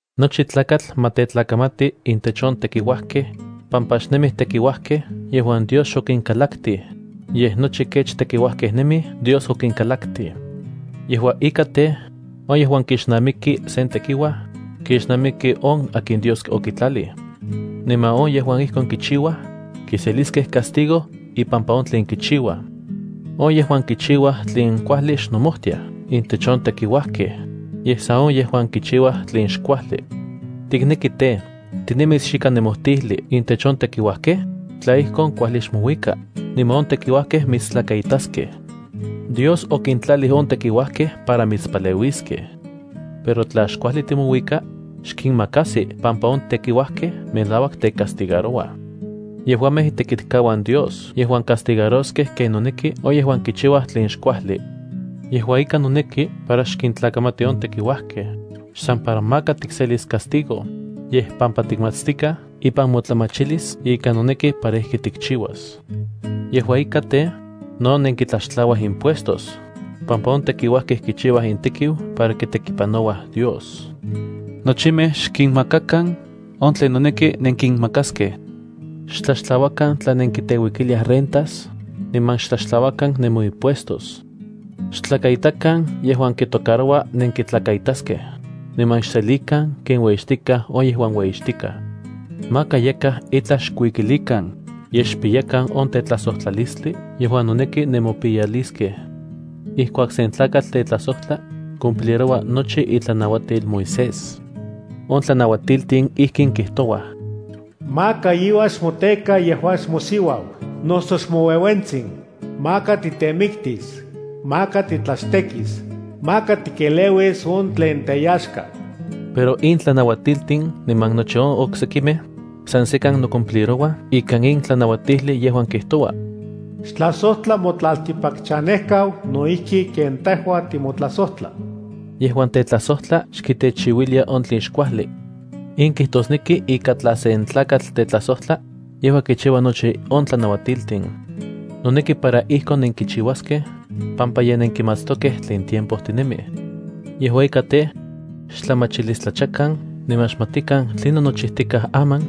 Nochi tlakatl ma tetlakamati intech on tekiuajkej, pampa xnemij tekiuajkej yejuan Dios xokinkalaktij, yej nochi kech tekiuajkej nemij Dios okinkalaktij. Yejua ika tej, on yejuan kixnamiki sen tekiuaj, kixnamiki on akin Dios okitlalij. Niman on yejuan ijkon kichiuaj, kiseliskej castigo ipampa on tlen kichiuaj. On yejuan kichiuaj tlen kuajli xnomojtiaj intech on tekiuajkej, yej san on yejuan kichiuaj tlen xkuajli. ¿Tikneki tej, tinemis xikan nemojtijli intech on tekiuajkej? Tla ijkon kuajli xmouika, niman on tekiuajkej mitstlakaitaskej. Dios okintlalij on tekiuajkej para mitspaleuiskej. Pero tla xkuajli timouika, xkinmakajsi pampa on tekiuajkej melauak tecastigarouaj. Yejuamej itekitkauan Dios yejuan castigaroskej ken noneki on yejuan kichiua tlen xkuajli. Yejua ika, noneki para xkintlakamati on tekiuajkej, xsan para maka tikselis castigo, yej pampa tikmatstikaj ipan motlamachilis ika noneki para ijki tikchiuas. Yejua ika tej, no nenkitlaxtlauaj impuestos, pampa on tekiuajkej kichiuaj intekiu para kitekipanouaj Dios. Nochimej xkinmamakan on tlen noneki nenkinmakaskej. Xtlaxtlauakan tla nenkiteuikiliaj rentas, niman xtlaxtlauakan nemoimpuestos. Xtlakaitakan yejuan kitocaroua nenkitlakaitaskej, niman xselikan ken ueyixtikaj on yejuan ueyixtikaj. Maka yakaj itlaj xkuikilikan, yej xpiyakan on tetlajsojtlalistli yejuan noneki nemopiyaliskej. Ijkuak sen tlakatl tetlajsojtla, cumpliroua nochi itlanauatil Moisés. On tlanauatiltin ijkin kijtouaj: “Maka iuan xmoteka yejuan xmosiuau noso xmoueuentsin, maka titemiktis, maka titlachtekis, maka tikeleuis on tlen teyaxka.” Pero in tlanauatiltin niman nochi on oksekimej, san sekan nocumplirouaj ika in tlanauajtijli yejuan ijkin kitoua: “Xtlajsojtla motlaltikpakchanejkau no ijki ken tejua timotlajsojtla.” Yejuan tetlajsojtla xkitechiuilia on tlen xkuajli. In kijtosneki ika tla sen tlakatl tetlajsojtla, yejua kichiua nochi on tlanauatiltin. Noneki para ijkon nenkichiuaskej, pampa ye nenkimatstokej tlen tiempo tinemij. Yejua ika tej, xtlamachilistlachakan niman xmatikan tlinon nochijtikaj aman,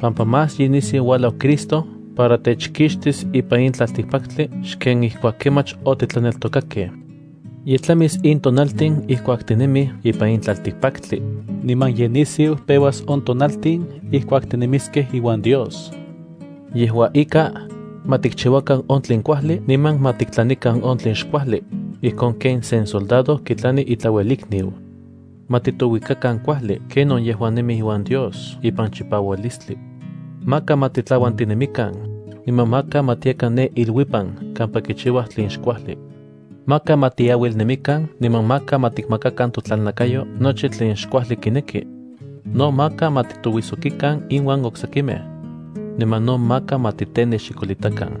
pampa más ye nisiu uajlau Cristo para techkixtis ipan in tlaltikpaktli xken ijkuak kemach otitlaneltokakej. Ye tlamis in tonaltin ijkuak tinemij ipan in tlaltikpaktli, niman ye nisiu peuas on tonaltin ijkuak tinemiskej iuan Dios. Yejua ika, ma tikchiuakan on tlen kuajli niman ma tiktlanikan on tlen xkuajli, ijkon ken sen soldado kitlani itlauelikniu. Ma titouikakan kuajli ken on yejuan nemij iuan Dios ipan chipaualistli. Maka ma titlauantinemikan, niman maka ma tiakan ne iluipan kampa kichiuaj tlen xkuajli. Maka ma tiauilnemikan niman maka ma tikmakakan totlalnakayoj nochi tlen xkuajli kineki. No maka ma titouijsokikan inuan oksekimej. Niman no maka ma titenexikolitakan.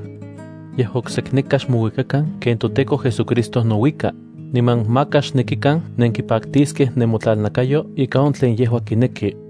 Yej oksekneka xmouikakan ken toTEKO JesuCristo nouika, niman maka xnekikan nenkipaktiskej nemotlalnakayo ika on tlen yejua kineki.